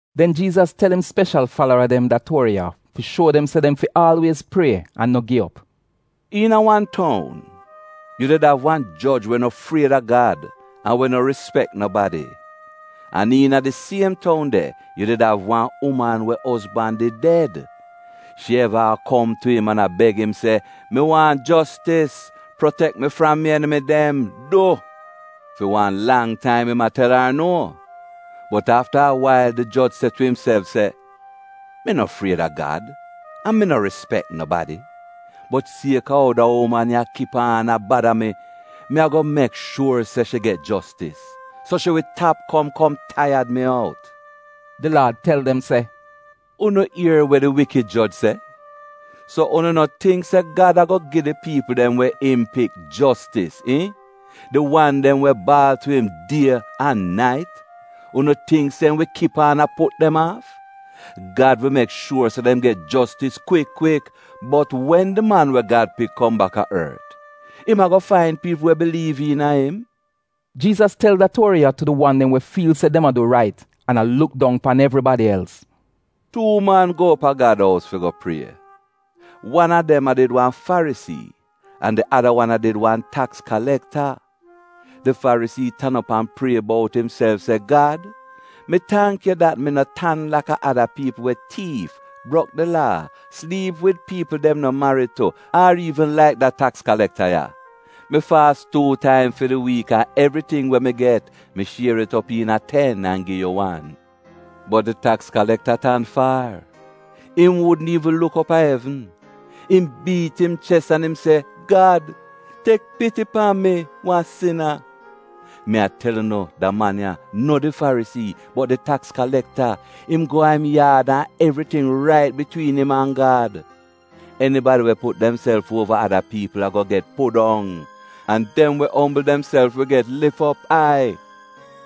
Den Jiizas tel im speshal falara dem da tuori ya fi shuo dem se dem fi aalwiez prie an no gi op. “Iina wan toun, yu did av wan joj we no fried a Gad an we no rispek nobadi. An iina di siem toun de yu did av wan uman we ozban did ded. Shi eva a kom tu im an a beg im se, ‘Mi waahn jostis, protek mi fram mi enimi dem, du!’ “Fi wan lang taim im a tel ar nuo. Bot afta a wail di joj se tu imself se, ‘Mi no fried a Gad an mi no rispek nobadi, bot siek-a ou da uman ya kip aan a bada mi, mi a-go mek shuor se shi get jostis, so shi wi tap kom kom taiyad mi out.’” Di Laad tel dem se, “Unu ier wa di wikid joj se? So unu no tingk se Gad a-go gi di piipl dem we im pik jostis, iihn, di wan dem we baal tu im die an nait? Unu tingk se im wi kip aan a put dem aaf? Gad wi mek shuor se dem get jostis kwik kwik. Bot wen di Man we Gad Pik kom baka ort, im a-go fain piipl we biliiv iina im?” Jiizas tel dem da tuori ya tu di wan dem we fiil se dem a du rait an a luk dong pan evribadi els: “Tuu man go op a Gad ous fi go prie. Wan a dem a did wan Farisii an di ada wan a did wan taks kalekta. Di Farisii tan op an prie bout imself se ‘Gad, mi tangk yu dat mi no tan laka ada piipl we tiif, brok di Laa, sliip wid piipl dem no marid tu, ar iivn laik da taks kalekta ya. Mi faas tuu taim fi di wiik an evriting we mi get mi shier it op iina a ten an gi yu wan.’ “Bot di taks kalekta tan faar. Im wudn iivn luk op a evn. Im biit im ches an im se, ‘Gad, tek piti pan mi, wan sina.’ “Mi a tel unu da man ya, no di Farisii, bot di taks kalekta, im go a im yaad an evriting rait bitwiin im an Gad. Enibadi we put demself uova ada piipl a-go get pudong, an dem we ombl demself, wi get lif op ai.”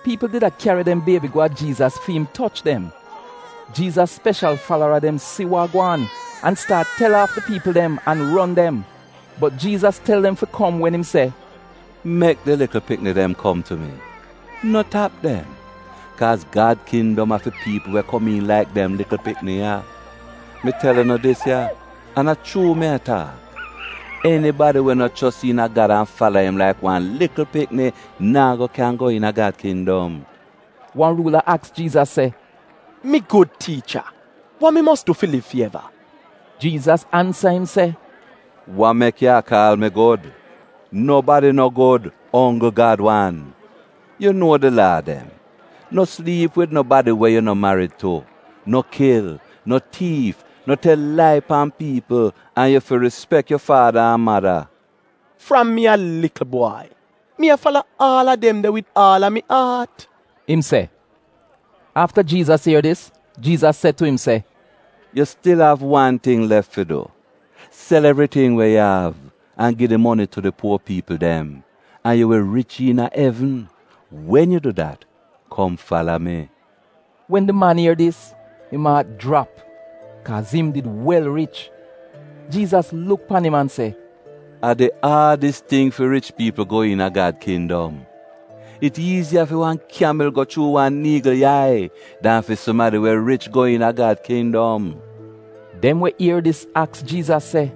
Piipl did a kyari dem biebi go a Jiizas fi im toch dem. Jiizas speshal falara dem si wa a gwaan an staat tel aaf di piipl dem an ron dem. Bot Jiizas tel dem fi kom wen im se, “Mek di likl pikni dem kom tu mi. No tap dem, kaaz Gad kindom a fi piipl we komiin laik dem likl pikni ya. Mi tel unu dis ya, an a chuu mi a taak, enibadi we no chos iina Gad an fala im laik wan likl pikni naa go kyan go iina Gad kindom.” Wan ruula aks Jiizas se, “Mi gud tiicha, wa mi mos du fi liv fi eva?” Jiizas ansa im se, “Wa mek yu kaal mi gud? Nobadi no gud, onggl Gad wan. Yu nuo di Laa dem: ‘No sliip wid nobadi we yu no marid tu, no kil, no tiif, no tel lai pan piipl an yu fi rispek yu faada an mada.’” “Fram mi a likl bwai, mi a fala aal a dem de wid aal a mi aat,” im se. Afta Jiizas ier dis, Jiizas se tu im se, “Yu stil av wan ting lef fi du. Sel evriting we yu av an gi di moni tu di puo piipl dem, an yu wi rich iina evn. Wen yu du dat, kom fala mi.” Wen di man ier dis, im aat jrap, kaaz im did wel rich. Jiizas luk pan im an se, “A di aadis ting fi rich piipl go iina Gad kindom! It iiziya fi wan kyamil go chuu wan niigl yai dan fi sumadi we rich go iina Gad kindom.” Dem we ier dis aks Jiizas se,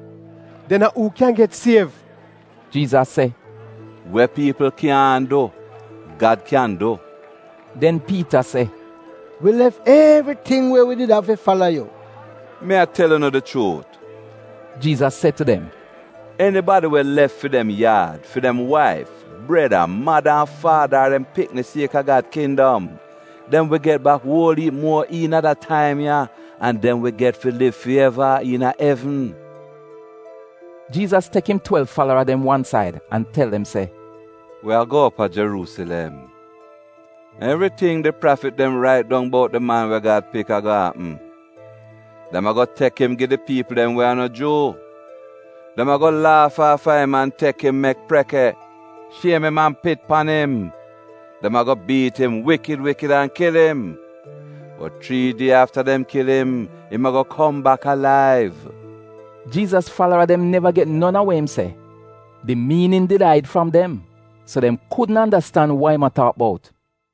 “Den a uu kyan get siev?” Jiizas se, “We piipl kyaahn du, Gad kyan du.” Den Piita se, “Wi lef evriting we wi did av fi fala yu!” “Mi a tel unu di chuut,” Jiizas se tu dem, “enibadi we lef fi dem yaad, fi dem waif, breda, mada an faada ar dem pikni siek-a Gad kindom, dem wi get bak uol iip muo iina da taim ya, an dem wi get fi liv fi eva iina evn.” Jiizas tek im twelv falara dem wan said an tel dem se, “Wi a go op a Jeruusilem, an evriting di prafit dem rait dong bout di Man we Gad Pik a-go apm. Dem a-go tek im gi di piipl we a no Juu. Dem a-go laaf aafa im an tek mi mek preke, shiem im an pit pan im. Dem a-go biit im wikid wikid an kil im. Bot chrii die afta dem kil im, im a-go kom bak alaiv.” Jiizas falara dem neva get non a we im se. Di miinin did aid fram dem, so dem kudn andastan wa im a taak bout.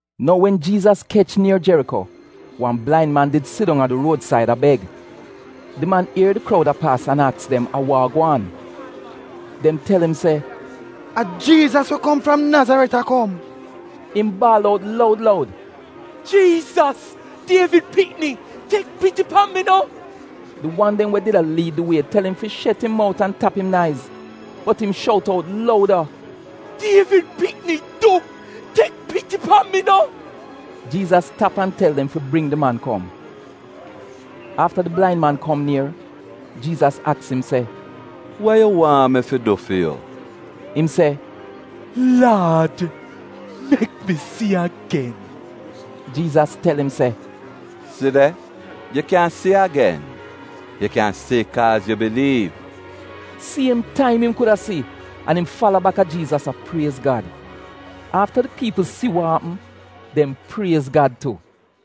Nou, wen Jiizas kech nier Jeriko, wan blain man did sidong a di ruod-said a beg. Di man ier di kroud a paas an aks dem a wa a gwaan. Dem tel im se, “A Jiizas we kom fram Nazaret a kom.” Im baal out loud loud, “Jiizas, Dievid pikni, tek piti pan mi no!” Di wan dem we did a liid di wie tel im fi shet im mout an tap im naiz, bot im shout out louda, “Dievid pikni, du, tek piti pan mi no!” Jiizas tap, an tel dem fi bring di man kom. Afta di blain man kom nier, Jiizas aks im se, “Wa yu waahn mi fi du fi yu?” Im se, “Laad, mek mi si agen.” Jiizas tel im se, “Si de, yu kyan si agen. Yu kyan si kaaz yu biliiv.” Siem taim im kuda si an im fala baka Jiizas a priez Gad. Afta di piipl si wa apm, dem priez Gad tu.